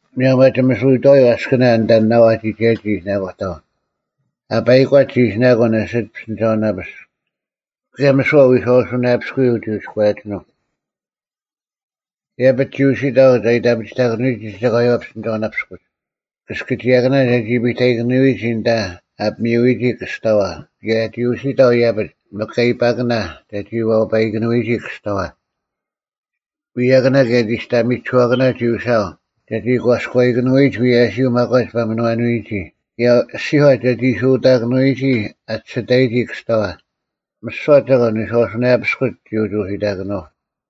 ᒧᔭᒻ ᐊ ᒋᒥᓱᐎᑥᐎ ᐊᔅᑭᓇ ᐊᓐᑕ ᓇᐤ ᐊ ᒋᒐᔭᒋ ᒋ ᐃᓯᓇᑯᑕᐤ᙮ ᐊ ᐸᐃᒂᒡ ᒋ ᐃᓯᓇᑯᓐ ᐊᓯᒡ ᐱᔅᑎᓂᒐᐅᓇᐱᔅᒄ᙮ ᑭᔭ ᒥᓯᐛ ᑲ ᐎᔄᐛᐱᔅᑯᔨᒡ ᒋ ᐎᔎᔭᒋᓂᒻ᙮ ᐃᔭᐱᒡ ᒋ ᐅᓯᑕᐤ ᒐ ᐃᑕᐱᑎᓂᔨᒋ ᒐᒂᔪᐛ ᐱᔅᑎᓂᒐᐅᓇᐱᔅᑯᒡ: ᑭᔅᑭᒋᔭᑭᓇ ᒐᒋ ᐱᑕᐃᑭᓄᐅᒋ ᐊᓐᑕ ᐊ ᐱᒥᐅᐎᒋ ᑭᔅᑕᐛ ᑭᔭ ᒋ ᐅᓯᑕᐤ ᐃᔭᐱᒡ ᒥᑲᐃᐸᑭᓇ ᒐᒋ ᐛᐸᔨᑭᓄᐎᒋ ᑭᔅᑕᐛ᙮ ᐎᔭᑭᓇ ᑭᔭ ᒋᔅᑕᒥᒋᓱᐛᑭᓇ ᒋ ᐅᓯᐊᐤ ᒐᒋ ᒂᔎᔨᑭᓄᐎᔨᒡ ᐎᔭᓯᔪᐤ ᒪᒂᒡ ᐸᒥᓄᐛᓄᐎᔨᒋ ᑭᔭ ᐊᔅᒋᒂ ᒐᒋ ᓱᑕᑭᓄᐎᒋ ᐊ ᒋᓯᑕᔨᒋ ᑭᔅᑕᐛ᙮ ᒥᓯᐛ ᒐᒂᓐ ᐎᔄᐛᐱᔅᑯᒡ ᒋ ᐅᒋ ᐅᓯᑕᑭᓄᐤ᙮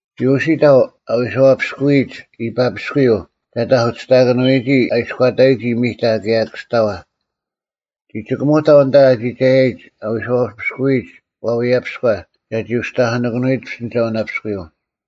ᒋ ᐅᓯᑕᐤ ᐊ ᐎᔄᐛᐱᔅᑯᔨᒡ ᐃᐸᐱᔅᑯᔪᐤ ᒐ ᑕᐧᑯᓯᔅᑕᑭᓄᔨᒋ ᐊ ᐃᔎᑕᒋ ᒥᑕ ᑭᔭ ᑭᔅᑕᐛ᙮ ᒋ ᒋᑭᒧᑕᐤ ᐊᓐᑕ ᐊᒋᒐᔨᒡ ᐊ ᐎᔄᐛᐱᔅᑯᔨᒡ ᐛᐎᔭᐱᔎ ᒐᒋ ᐅᒋ ᑕᐧᑯᓂᑭᓄᐅᐎᒡ ᐱᔅᑎᓂᒐᐅᓇᐱᔅᑯᔪᐤ᙮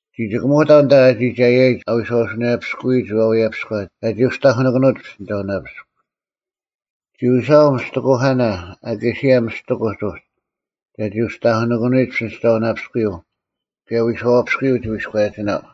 ᒋ ᒋᑭᒧᑕᐤ ᐊᓐᑕ ᐊ ᒋᒐᔭᔨᒡ ᐊ ᐎᔄᐛᐱᔅᑯᔨᒡ ᐛᐎᔭᐱᔎ ᒐᒋ ᐅᒋ ᑕᐧᑯᓇᑭᓄᐅᒡ ᐱᔅᑎᓂᒐᐅᓇᐱᔅᒄ᙮ ᒋ ᐅᓯᐊᐤ ᒥᔅᑎᑯᐧᑲᓇ ᐊᑲᓯᔭ ᒥᔅᑎᑯᒡ ᐅᒡ ᒐ ᐅᒋ ᑕᐧᑯᓇᑭᓄᐎᒡ ᐱᔅᑎᓂᒐᐅᓇᐱᔅᑯᔪᐤ ᑭᔭ ᐎᔄᐛᐱᔅᑯᔪᐤ ᒋ ᐎᔎᔭᒋᓇᐤ᙮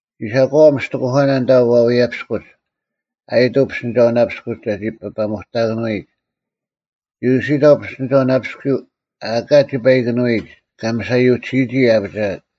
ᒋ ᓴᒂᐛᐤ ᒥᔅᑎᑯᐧᑲᓇ ᐊᓐᑕ ᐛᐎᔭᐱᔅᑯᒡ ᐊᔨᑐᐤ ᐱᔅᑎᓂᒐᐅᓇᐱᔅᑯᒡ ᒐᒋ ᐱᐸᒧᑕᑭᓄᐎᒡ᙮ ᒋ ᐅᓯᑕᐤ ᐱᔅᑎᓂᒐᐅᓇᐱᔅᑯᔪᐤ ᐊ ᐊᑲ ᒋᐸᐃᑭᓄᐎᒡ ᑲ ᒥᓴᔪᒋᓯᔨᒋ ᐊ ᐊᐱᒋᐊᑦ᙮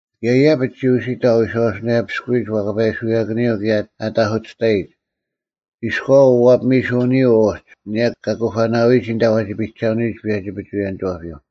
ᑭᔭ ᐃᔭᐱᒡ ᒋ ᐅᓯᑕᐤ ᐊ ᐎᔄᐛᐱᔅᑯᔨᒡ ᐛᐸᑲᐎᓱᔭᑭᓂᔪᐤ ᑭᔭ ᐊᑕᐧᑯᑎᔅᑕᔨᒡ ᐃᔎᐛ ᐅᐛᐱᒥᓱᓂᔨᐛ ᐅᒡ ᐊᓂᔭ ᑲ ᑯᐸᓇᐎᒋ ᐊᓐᑕ ᐛᒋ ᐱᒐᓄᐎᒡ ᐸᔭᒋ-ᐱᒍᐎᔭᓂᒋᐛᐱᔪᐤ᙮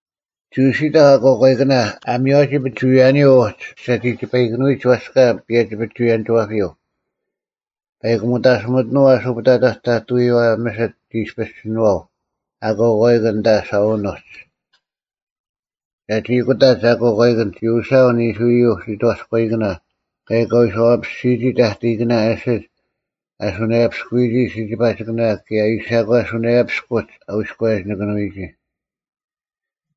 ᒋ ᐅᓯᑕᐤ ᐊᑯᐛᑲᐃᑭᓇ ᐊ ᒥᔽᔨᒋ ᐱᒍᐎᔭᓂᔪᐤ ᐅᒡ ᒐᒋ ᒋᐸᐃᑭᓄᐎᒡ ᐊᔅᑲ ᐸᔭᒋ-ᐱᒍᐎᔭᓂᒋᐛᐱᔪᐤ᙮ ᐸᐃᑯ ᒥᑕᓯᒥᑎᓄᐤ ᐊᓱ ᐱᑕᑕᒡ ᑕᑐᔪᐛ ᒥᓯᑦ ᒋ ᐃᔅᐱᔅ ᒋᓏᐤ ᐊᑯᐛᑲᐃᑭᓐ ᐊᓐᑕ ᓴᐅᓄᒡ᙮ ᒐᒋ ᑯᑕᒡ ᐊᑯᐛᑲᐃᑭᓐ ᒋ ᐅᓯᐊᐤ ᓂᓱᔪᐤ ᓯᑥᔎᐃᑭᓇ ᑭᔭ ᑲ ᐎᔄᐛᐱᔅᒋᔨᒋ ᑕᑕᐃᑭᓇ ᐊᓯᒡ ᐊ ᓱᓇᔭᐱᔅᑯᔨᒋ ᓯᒋᐸᒋᑭᓇ ᑭᔭ ᐃᓴᒂ ᓱᓇᔭᐱᔅᑯᒡ ᐊᐎᔎᔭᒋᓂᑭᓄᐎᒋ᙮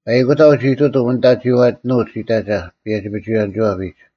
ᐸᐃᑯᑕᐤ ᒋ ᐃᑐᑎᒻ ᐊᓐᑕ ᒋᐛᑎᓄᒡ ᐃᑕᒐ ᐸᔭᒋ-ᐱᒍᐎᔭᓂᒋᐛᐱᒡ᙮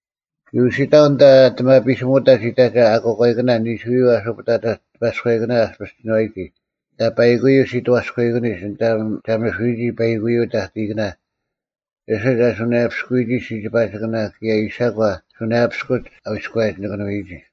ᒋ ᐅᓯᑕᐤ ᐊᓐᑕ ᐊᑎᒪᐱᓯᒧᑕᒡ ᐃᑕᒐ ᐊᑯᐛᑲᐃᑭᓇ ᓂᓱᔪᐤ ᐊᓱ ᐸᑕᑕᒡ ᑎᐸᔎᐃᑭᓇ ᐊᔅᐱᔅ ᒋᓏᔨᒋ ᐊᓐᑕ ᐸᐃᑯᔪᐤ ᓯᑥᔎᐃᑭᓂᒡ ᐊᓐᑕ ᒐᒥᓱᐎᒋ ᐸᐃᑯᔪᐤ ᑕᑕᐃᑭᓇ ᐊᓯᒡ ᐊ ᓱᓇᔭᐱᔅᑯᔨᒋ ᓯᒋᐸᒋᑭᓇ ᑭᔭ ᐃᓴᒂ ᓱᓇᔭᐱᔅᑯᒡ ᐊᐎᔎᔭᒋᓂᑭᓄᐎᒋ᙮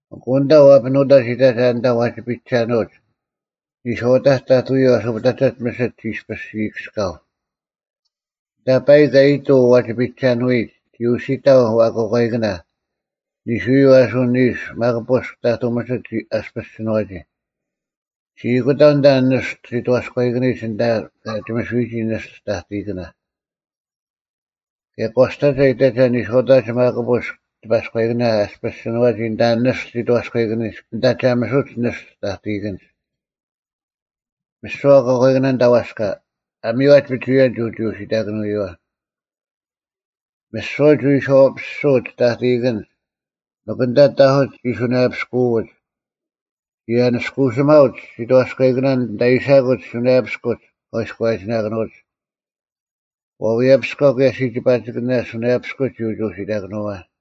ᐊᑯ ᐊᓐᑕ ᐛᐱᓄᑕᒡ ᐃᑕᒐ ᐊᓐᑕ ᐛᒋ ᐱᒐᓄᐅᒡ: ᓂᔄᐅᑕᒡ ᑕᑐᔪᐤ ᐊᓱ ᐱᑕᑕᒡ ᒥᓯᑦ ᒋ ᐃᔅᐱᔅ ᐃᔨᑭᔅᑲᐤ᙮ ᐊᓐᑕ ᐸᐃᒄ ᐊᔨᑐᐤ ᐛᒋ ᐱᒐᓄᐎᒡ ᒋ ᐅᓯᑕᐤ ᐊᑯᐛᑲᐃᑭᓇ ᓂᓱᔪᐤ ᐊᓱ ᓂᓱ ᒪᒃ ᐳᔅᒃ ᑕᑐᐤ ᒥᓯᑦ ᐊᔅᐱᔅ ᒋᓏᔨᒋ᙮ ᒋ ᐊᑯᑕᐤ ᐊᓐᑕ ᓂᔅᑐ ᓯᑥᔎᐃᑭᓂᒡ ᐊᓐᑕ ᑲ ᒋᒥᓱᐎᒋ ᓂᔅᑐ ᑕᑕᐃᑭᓇ᙮ ᑭᔭ ᒂᔅᑕᒐ ᐃᑕᒐ ᓂᔄᐅᑕᒡ ᒪᒃ ᐳᔅᒄ ᑎᐸᔎᐃᑭᓇ ᐊᔅᐱᔅ ᒋᓏᒋ ᐊᓐᑕ ᓂᔅᑐ ᓯᑥᔎᐃᑭᓂᒡ ᐊᓐᑕ ᒐ ᒥᓱᒡ ᓂᔅᑐ ᑕᑕᐃᑭᓐᒡ᙮ ᒥᓯᐛ ᐊᑯᐛᑲᐃᑭᓇ ᐊᓐᑕ ᐛᔅᑲ ᐊ ᒥᔽᓯᒡ ᐱᒍᐎᔭᓐ ᒋ ᐅᒋ ᐅᓯᑕᑯᓄᐎᐛ᙮ ᒥᓯᐛ ᒋ ᐎᔄᐛᐱᔅᒍᐅᒡ ᑕᑕᐃᑭᓐᒡ, ᒥᒄ ᐊᓐᑕ ᑕᐧᑯᒡ ᒋ ᓱᓇᔭᐛᐱᔅᒍᐅᒡ, ᒋ ᐊᓂᔅᑯᓯᒪᐅᒡ ᓯᑥᔅᑲᐃᑭᓐᒡ ᐊᓐᑕ ᐃᓴᑯᒡ ᓱᓇᔭᐱᔅᑯᒡ ᑲ ᐎᔎᔭᒋᓇᑭᓄᐅᒡ᙮ ᐛᐎᔭᐱᔅᔎ ᑭᔭ ᓯᒋᐸᒋᑭᓇ ᓱᓇᔭᐱᔅᑯᒡ ᒋ ᐅᒋ ᐅᓯᑕᑭᓄᐛ᙮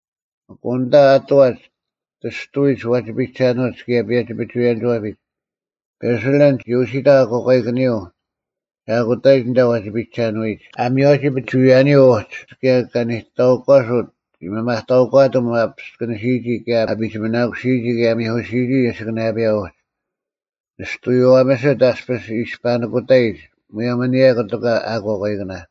ᐊᑯ ᐊᓐᑕ ᐊᑐᐛᒡ ᑎᔅᑐᐎᒡ ᐛᒋ ᐱᒐᓄᐅᒡ ᑭᔭ ᐸᔭᒋ-ᐱᒍᐎᔭᓂᒋᐛᐱᒡ, ᐱᓴᓕᓪ ᒋ ᐅᓯᑕᐤ ᐊᑯᐛᑲᐃᑭᓂᔪᐤ ᒐ ᐊᑯᑕᔨᒡ ᐊᓐᑕ ᐛᒋ ᐱᒐᓄᐎᒡ, ᐊ ᒥᔽᔨᒋ ᐱᒍᐎᔭᓂᔪᐤ ᐅᒡ ᑭᔭ ᑲ ᓂᑕᐅᒂᓱᑦ ᒋ ᒥᒪᑕᐅᒂᑎᒻ ᐊ ᐱᔅᑭᓂᓯᔨᒋ ᑭᔭ ᐊ ᐱᒋᒥᓇᑯᓯᔨᒋ ᑭᔭ ᐊ ᒥᐧᑯᓯᔨᒋ ᐊᓯᑭᓇᔭᐱᔭ ᐅᒡ᙮ ᓂᔅᑐᔪᐛ ᒥᓯᑦ ᐊᔅᐱᔅ ᐃᔅᐸᓂᑯᑕᔨᒡ ᒧᔭᒻ ᐊᓂᔭ ᑯᑎᒂ ᐊᑯᐛᑲᐃᑭᓇ᙮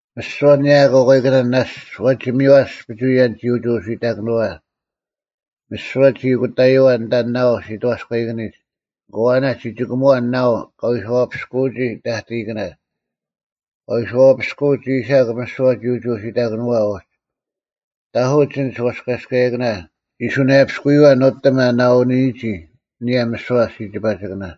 ᒥᓯᐛ ᐊᓂᔭ ᐊᑯᐛᑲᐃᑭᓇ ᓇᔅᒡ ᐛᒋ ᒥᔽᔅᒡ ᐱᒍᐎᔭᓐ ᒋ ᐅᒋ ᐛᓯᑕᑭᓂᔪᐛ᙮ ᒥᓯᐛ ᒋ ᐊᑯᑕᔪᐛ ᐊᓐᑕ ᓇᐤ ᓯᑥᔎᐃᑭᓂᒡ ᐊᑯ ᐊᓇᒡ ᒋ ᒋᑭᒧᐛ ᓇᐤ ᑲ ᐎᔄᐛᐱᔅᑯᔨᒋ ᑕᑕᐃᑭᓇ, ᑲ ᐎᔄᐛᐱᔅᑯᒡ ᐃᓴᒄ ᒥᓯᐛ ᒋ ᐅᒋ ᐛᓯᑕᑭᓂᔪᐛ ᐅᒡ᙮ ᑕᐧᑯᒡ ᐊᓐᒡ ᐛᔅᑲᔭᔅᑯᓂᑭᓇ ᒋ ᓱᓇᔭᐱᔅᑯᔪᐛ ᓄᑎᒻ ᐊ ᓇᐅᓂᔨᒋ ᐊᓂᔭ ᒥᓯᐛ ᓯᒋᐸᒋᑭᓇ᙮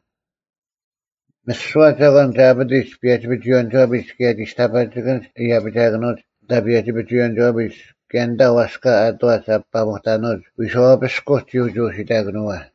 ᒥᓯᐛ ᒐᒂᓐ ᒐ ᐊᐱᑎᒡ ᐸᔭᒋ-ᐱᒍᐎᔭᓂᒋᐛᐱᒡ ᑭᔭ ᒋᔅᑕᐸᒋᑭᓐᒡ ᐃᔭᐱᒋᐊᑭᓄᐅᒡ ᐊᓐᑕ ᐸᔭᒋ-ᐱᒍᐎᔭᓂᒋᐛᐱᒡ ᑭᔭ ᐊᓐᑕ ᐛᔅᑲ ᐊᑐᐛᒡ ᐊ ᐱᐸᒧᑕᓄᒡ ᐎᔄᐛᐱᔅᑯᒡ ᒋ ᐅᒋ ᐅᓯᑕᑭᓄᐅᐛ᙮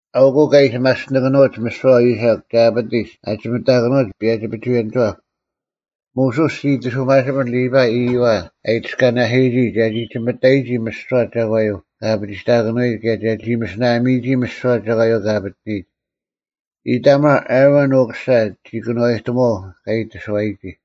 ᐊᐅᑯᐤ ᑲ ᐃᓯ ᒪᔅᑎᓂᑭᓄᐅᒡ ᒥᓯᐛ ᐃᓴᒄ ᑲ ᐊᐱᑎᒡ ᐊ ᒋᒥᑕᑭᓄᐅᒡ ᐸᔭᒋ-ᐱᒍᐎᔭᓂᒋᐛᑉ᙮ ᒧᓱᔅ ᒋ ᐃᑎᓱᒪᓯᐱᓐ ᓕᐸᐃ ᐃᔪᐛ ᐊ ᐃᑎᔅᑲᓇᓯᔨᒋ ᒐᒋ ᒋᒥᔨᒋ ᒥᓯᐛ ᒐᒂᔪᐤ ᑲ ᐊᐱᒋᑕᑭᓄᐎᒡ ᑭᔭ ᒐᒋ ᒥᓯᓇᒥᔨᒋ ᒥᓯᐛ ᒐᒂᔪᐤ ᑲ ᐊᐱᑎᓂᔨᒡ᙮ ᐃᑕᒪᕐ ᐊᕋᓐ ᐅᑯᓴ, ᓇᑭᑐᐛᔨᒪᐤ ᑲ ᒋᑕᓱᐎᒋ᙮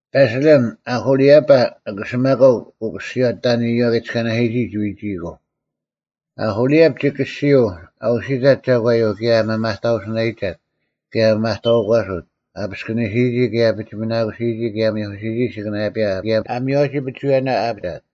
ᐱᓴᓕᓪ ᐅᐦᐅᓕᐊᐸ, ᐊᐦᐃᓴᒪᑲ ᐅᑯᓯᔨᐛ, ᑕᐊᓐ ᐃᔪᐛ ᑲ ᐃᑎᔅᑲᓇᓯᔨᒋ, ᒋ ᐎᒋᐃᑯᐤ᙮ ᐅᐦᐅᓕᐊᑉ ᒋ ᑭᔅᒋᐅᐤ ᐊᐅᓯᑕᑦ ᒐᒂᔪᐤ ᑭᔭ ᐊ ᒥᒪᑕᐅᓯᓇᔨᒐᑦ ᑭᔭ ᐊ ᒥᒪᑕᐅᒂᓱᑦ ᐊ ᐱᔅᑭᓂᓯᔨᒋ ᑭᔭ ᐊ ᐱᒋᒥᓇᑯᓯᔨᒋ ᑭᔭ ᐊ ᒥᐧᑯᓯᔨᒋ ᐊᓯᑭᓇᔭᐱᔭ ᑭᔭ ᐊ ᒥᔽᓯᔨᒋ ᐱᒍᐎᔭᓇ ᐊ ᐊᐱᒋᐊᑦ᙮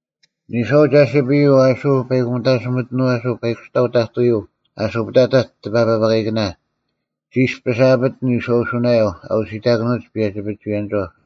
ᓂᔄᐤ ᒐᓯᐱᔪᐤ ᐊᓱ ᐸᐃᑯᒥᑕᓯᒥᑎᓄᐤ ᐊᓱ ᐸᐃᑯᔅᑕᐤ ᑕᑐᔪᐤ ᐊᓱ ᐱᑕᑕᒡ ᑎᐸᐸᑲᐃᑭᓇ, ᒋᔅᐱᔅ ᐊᐱᑎᓐ ᐎᔄᐅᓱᓇᔭᐤ ᐊ ᐅᓯᑕᑭᓄᐅᒡ ᐸᔭᒋ-ᐱᒍᐎᔭᓂᒋᐛᑉ᙮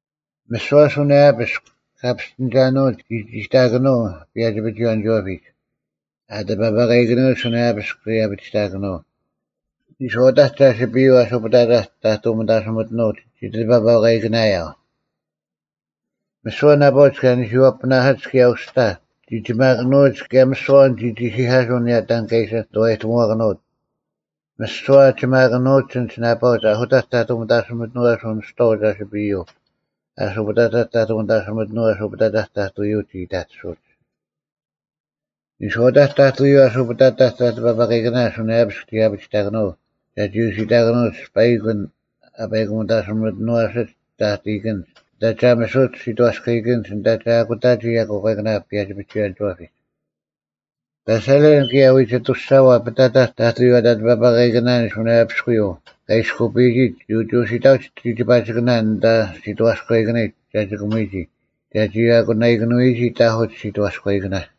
ᒥᓯᐛ ᓱᓇᔭᐱᔅᒄ ᑲ ᐱᔅᑎᓂᒐᓄᐅᒡ ᒋ ᒋᑕᑭᓄᐤ ᐸᔭᒋ-ᐱᒍᐎᔭᓂᒋᐛᐱᒡ ᐊ ᑎᐸᐸᑲᐃᑭᓄᐅᒡ ᓱᓇᔭᓇᐱᔅᒃ ᒋ ᐊᐱᒋᑕᑭᓄᐤ᙮ ᓂᔄᐅᑕᒡ ᒐᓯᐱᔪᐤ ᐊᓱ ᐱᑕᑕᒡ ᑕᑐ ᒥᑕᓯᒥᑎᓄᐤ ᒋ ᑕᑎᐸᐸᑲᐃᑭᓇᔭᐤ᙮ ᒥᓯᐛ ᓇᐸᐅᒡ ᑲ ᓂᓱᔪᐛᐳᓇᓯᒡ ᑭᔭ ᐅᔅᑕ ᒋ ᒋᒪᑭᓄᐎᒡ ᑭᔭ ᒥᓯᐛ ᐊᐛᓐ ᒋ ᒋᓯᐧᑲᓱᐤ ᐊᓂᔭ ᑕᓐ ᑲ ᐃᓯ ᓂᑐᐛᔨᑎᒧᐛᑭᓄᐅᑦ᙮ ᒥᓯᐛ ᐊ ᒋᒪᑭᓄᐅᒡ ᐊᓐᒡ ᓇᐸᐅᒡ ᐊᓱᑕᒡ ᑕᑐ ᒥᑕᓯᒥᑎᓄᐤ ᐊᓱ ᓂᔍᐤ ᒐᓯᐱᔪᐤ ᐊᓱ ᐱᑕᑕᒡ ᑕᑐ ᒥᑕᓯᒥᑎᓄᐤ ᐊᓱ ᐱᑕᑕᒡ ᑕᑐᔪᐤ ᒋ ᐃᑕᑎᓱᐅᒡ᙮ ᓂᔄᐅᑕᒡ ᑕᑐᔪᐤ ᐊᓱ ᐱᑕᑕᒡ ᑎᐸᐸᑲᐃᑭᓇ ᓱᓇᔭᐱᔅᒄ ᒋ ᐊᐱᒋᑕᑭᓄᐤ ᒐᒋ ᐅᓯᐊᑭᓄᑦ ᐸᐃᒄ ᐊᓐ ᐊ ᐸᐃᑯᒥᑕᓯᒥᑎᓄᐛᓯᒡ ᑕᑕᐃᑭᓐᒡ ᐊᓐᑕ ᒐ ᒋᒥᓱᒡ ᓯᑥᔅᑲᐃᑭᓐᒡ ᐊᓐᑕ ᒐ ᐊᑯᑕᒋ ᐊᑯᐛᑲᐃᑭᓇ ᐸᔭᒋ-ᐱᒍᐎᔭᓂᒋᐛᐱᒡ᙮ ᐱᓴᓕᓪ ᑭᔭ ᐎᒋᑐᔅᒐᐛ ᐱᑕᑕᒡ ᑕᑐᔪᐛ ᑎᐸᐸᑲᐃᑭᓇ ᓱᓇᔭᐱᔅᑯᔪᐤ ᑲ ᐃᔅᑯᐱᔨᒡ ᒋ ᐅᒋ ᐅᓯᑕᐅᒡ ᓯᒋᐸᒋᑭᓇ ᐊᓐᑕ ᓯᑥᔎᔨᑭᓂᒡ ᒐ ᒋᑭᒧᐎᒋ ᒐᒋ ᐊᑯᓇᐃᑭᓄᐎᒋ ᑕᐧᑯᒡ ᓯᑥᔎᔨᑭᓇ᙮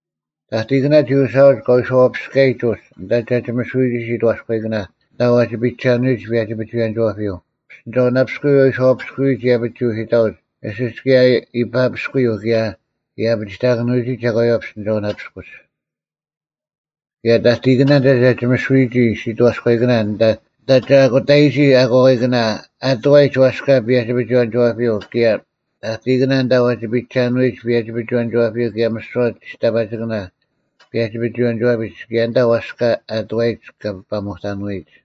ᑕᑕᐃᑭᓇ ᒋ ᐅᓯᐊᐅᒡ ᑲ ᐎᔄᐛᐱᔅᑲᔨᒡ ᐅᒡ ᐊᓐᑕ ᒐ ᒋᒥᓱᐎᒋ ᓯᑥᔎᔨᑭᓇ ᐊᓐᑕ ᐛᒋ ᐱᔨᒐᓄᐎᒡ ᐸᔭᒋ-ᐱᒍᐎᔭᓂᒋᐛᐱᔪᐤ᙮ ᐱᔅᑎᓂᒐᐅᓇᐱᔅᑯᔪᐤ ᐊ ᐎᔄᐛᐱᔅᑯᔨᒡ ᐃᔭᐱᒡ ᒋ ᐅᓯᑕᐅᒡ ᐊᓯᒡ ᑭᔭ ᐃᐸᐱᔅᑯᔪᐤ ᑭᔭ ᐃᔭᐱᒋᑕᑭᓂᐎᒋ ᒐᒂᔪᐛ ᐱᔅᑎᓂᒐᐅᓇᐱᔅᑯᒡ᙮ ᑭᔭ ᑕᑕᐃᑭᓇ ᐊᓐᑕ ᒐ ᒋᒥᓱᐎᒋ ᓯᑥᔎᔨᑭᓇ ᐊᓐᑕ ᒐ ᐊᑯᑕᔨᒋ ᐊᑯᐛᑲᐃᑭᓇ ᐊᑐᐛᔨᒡ ᐛᔅᑲ ᐸᔭᒋ-ᐱᒍᐎᔭᓂᒋᐛᐱᔪᐤ ᑭᔭ ᑕᑕᐃᑭᓇ ᐊᓐᑕ ᐛᒋ ᐱᒐᓄᐎᔨᒡ ᐸᔭᒋ-ᐱᒍᐎᔭᓂᒋᐛᐱᔪᐤ ᑭᔭ ᒥᓯᐛ ᒋᔅᑕᐸᒋᑭᓇ ᐸᔭᒋ-ᐱᒍᐎᔭᓂᒋᐛᐱᒡ ᑭᔭ ᐊᓐᑕ ᐛᔅᑲ ᐊᑐᐛᔨᒡ ᑲ ᐱᐸᒧᑕᓄᐎᒡ᙮